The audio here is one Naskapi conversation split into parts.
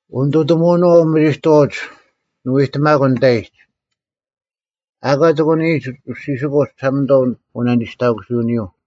ᐅᓂᑐᑎᒧᐅᓄᐛᐤ ᐅᒥᒋᑥᐅᒡ ᓂᐎᑎᒪᑯᓐ ᓂᑕᐃᒡ, “ᐊᑲ ᐊ ᑎᒂᓂᔨᒡ ᐅᔅᒋᓯᑯᒡ ᒋᓴᒪᓂᑐᐛ ᐅᓇᓂᒋᔅᑕᑯᓱᐅᓂᔪᐤ᙮”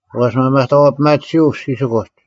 ᐛᔅ ᒪᒪᑕᐛᐱᒥᑎᓱᐤ ᐅᔅᒋᓯᑯᒡ,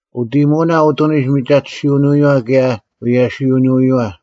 ᐅᑦ ᐃᔨᒧᐅᓇ ᐅᑐᓂᒡ ᒥᒐᑎᓯᐅᓂᔪᐛ ᑭᔭ ᐎᔭᓯᐃᐛᐅᓂᔪᐛ: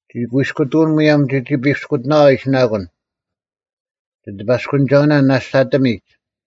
ᒋᑯᐃᔅᑯᑐᐅᓐ ᒧᔭᒻ ᒋᒋ ᐱᔅᑯᑎᓇᐛ ᐃᓯᓇᒂᓐ; ᒋᑎᐸᔅᑯᓂᒐᐅᓇ ᓇᔅᒡ ᐊᑎᒥᒡ: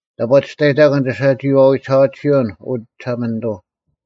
ᑕᑈ ᒋᔅᑕᔨᑕᑯᓐ ᒋᓴᒋᐃᐛᐎ ᒋᓴᐛᑎᓯᐅᓐ, ᐅ ᒋᓴᒪᓂᑐᐤ!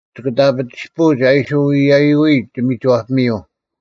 ᒋᑭ ᑕᐱ ᒋᔅᐳᐅᒡ ᐊ ᐃᓯ ᐎᔨᔪᐎᒡ ᒋᒥᒋᐛᐱᒥᔪᐤ;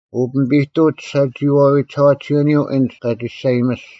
ᐅ ᐱᒥᐱᑐᐅᒡ ᒋᓴᒋᐃᐛᐎ ᒋᓴᐛᑎᓯᐅᓂᔪᐤ ᐊᓐᒡ ᑲ ᒋᔅᒐᔨᒥᔅᒡ;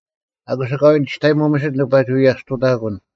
ᐊᑯᔅ ᐊᑲᐎᔾ ᒋᔅᑕᔨᒧᐤ ᒥᓯᑦ ᓂᑭ ᐸᒋ ᐎᔭᔅᑐᑕᑯᓐ,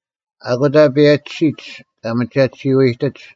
ᐊᑯᑕ ᐸᒋᓯᒡ ᑲ ᒥᒐᑎᓯᔪᐤ ᐊᐃᑎᒡ: